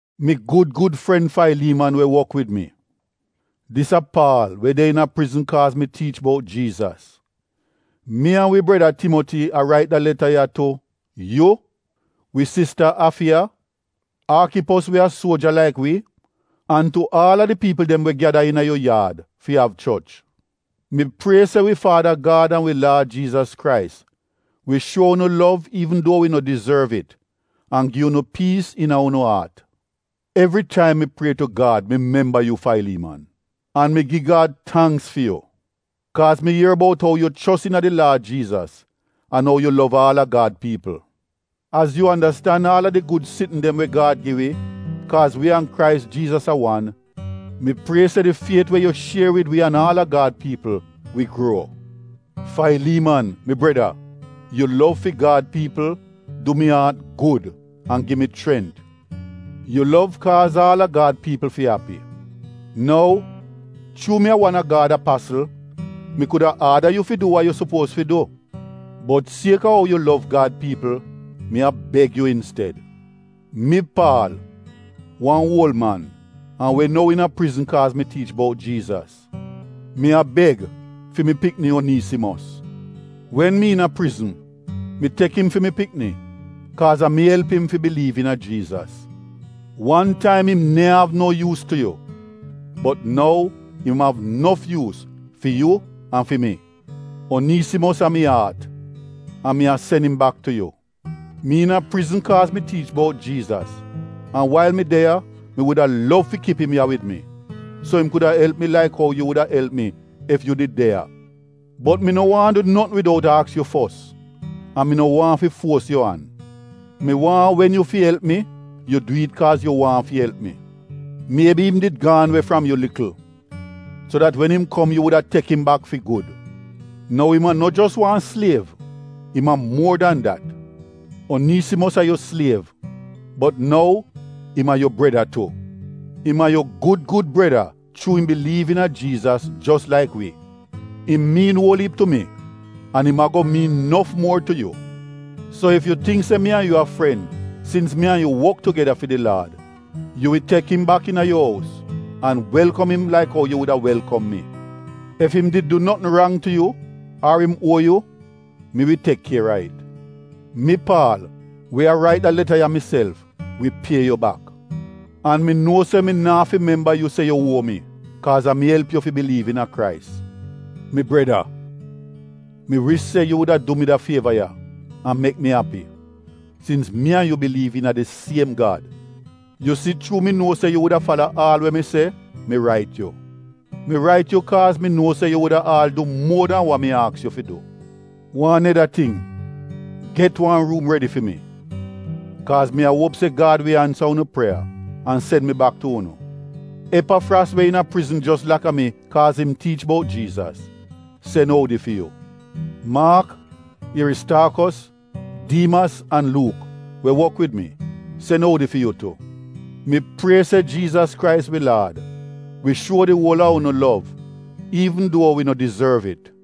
Mi gud gud fren Failiiman we wok wid mi, dis a Paal we de iina prizn kaaz mi tiich bout Jiizas. Mi an wi breda Timoti a rait de leta ya tu: yu, wi sista Afiya, Aakipos we a suoja laik wi an tu aal a di piipl dem we gyada iina yu yaad fi av choch. Mi prie se wi faada Gad an wi Laad Jiizas Krais wi shuo unu lov iivn duo wi no dizorv it an gi unu piis iina unu aat. Evri taim mi prie tu Gad mi memba yu Failiiman. An mi gi Gad tangks fi yu, kaaz mi ier bout ou yu chos iina di Laad Jiizas an ou yu lov aal a Gad piipl. Az yu andastan aal a di gud sitn dem we Gad gi wi kaaz wi an Krais Jiizas a wan, mi prie se di fiet we yu shier wid wi an aal a Gad piipl wi gruo. Failiiman, mi breda, yu lov fi Gad piipl, du mi aat gud an gi mi chrent. Yu lov kaaz aal a Gad piipl fi api. Nou, chuu mi a wan a Gad apasl, mi kuda aada yu fi du wa yu sopuoz fi du. Bot sieka ou yu lov Gad piipl mi a beg yu insted. Mi, Paal, wan oul man an we nou iina prizn kaaz mi tiich bout Jiizas, Mi a beg fi mi pikni Oniisimos. Wen mi iina prizn, mi tek im fi mi pikni kaaz a mi elp im fi biliiv iina Jiizas. Wan taim im neehn av no yuus tu yu, bot nou im av nof yuus fi yu an fi mi. Oniisimos a mi aat, an mi a sen im bak tu yu. Mi iina prizn kaaz mi tiich bout Jiizas an wail mi de ya mi wuda lov fi kip im ya wid mi, so im kuda elp mi laik ou yu wuda elp mi ef yu did de ya. Bot mi no waahn du notn widout aks yu fos an mi no waahn fi fuos yu an. Mi waahn wen yu fi elp mi yu du it kaaz yu waahn fi elp mi. Miebi im did gaan we fram yu likl, so dat wen im kom yu wuda tek im bak fi gud. Nou im a no jos wan sliev, im a muor dan dat. Oniisimos a yu sliev bot nou im a yu breda tu. Im a yu gud gud breda chuu im biliiv iina Jiizas jos laik wi. Im miin uol iip tu mi an im ago miin nof muor tu yu. So ef yu tingk se mi an yu a paadi sins mi an yu wok tugeda fi di Laad, yu wi tek im bak iina yu ous an welkom im laik ou yu wuda welkom mi. Ef im did du notn rang tu yu ar im uo yu, mi wi tek kier a it. Mi, Paal we a rait da leta ya miself, wi pie yu bak. An mi nuo se mi naa fi memba yu se yu uo mi, kaaz a mi elp yu fi biliiv iina Krais. Mi breda mi wish se yu wuda du mi da fieva ya an mek mi api, sins mi an yu biliiv iina di siem Gad. Yu si chuu mi nuo se yu wuda fala aal we mi se, mi rait yu. Mi rait yu kaaz mi nuo se yu wuda aal du muor dan wa mi aks yu fi du. Aneda ting, get wan ruum redi fi mi, kaaz mi a uop se Gad wi ansa unu prieya an sen mi bak tu unu. Epafras we iina prizn jos laka mi kaaz im tiich bout Jiizas, sen oudi fi yu. Maak, Ieristaakos, Diimas an Luuk, we wok wid mi, sen oudi fi yu tu. Mi prie se Jiizas Krais wi Laad wi shuo di uol a unu lov iivn duo wi no dizorv it.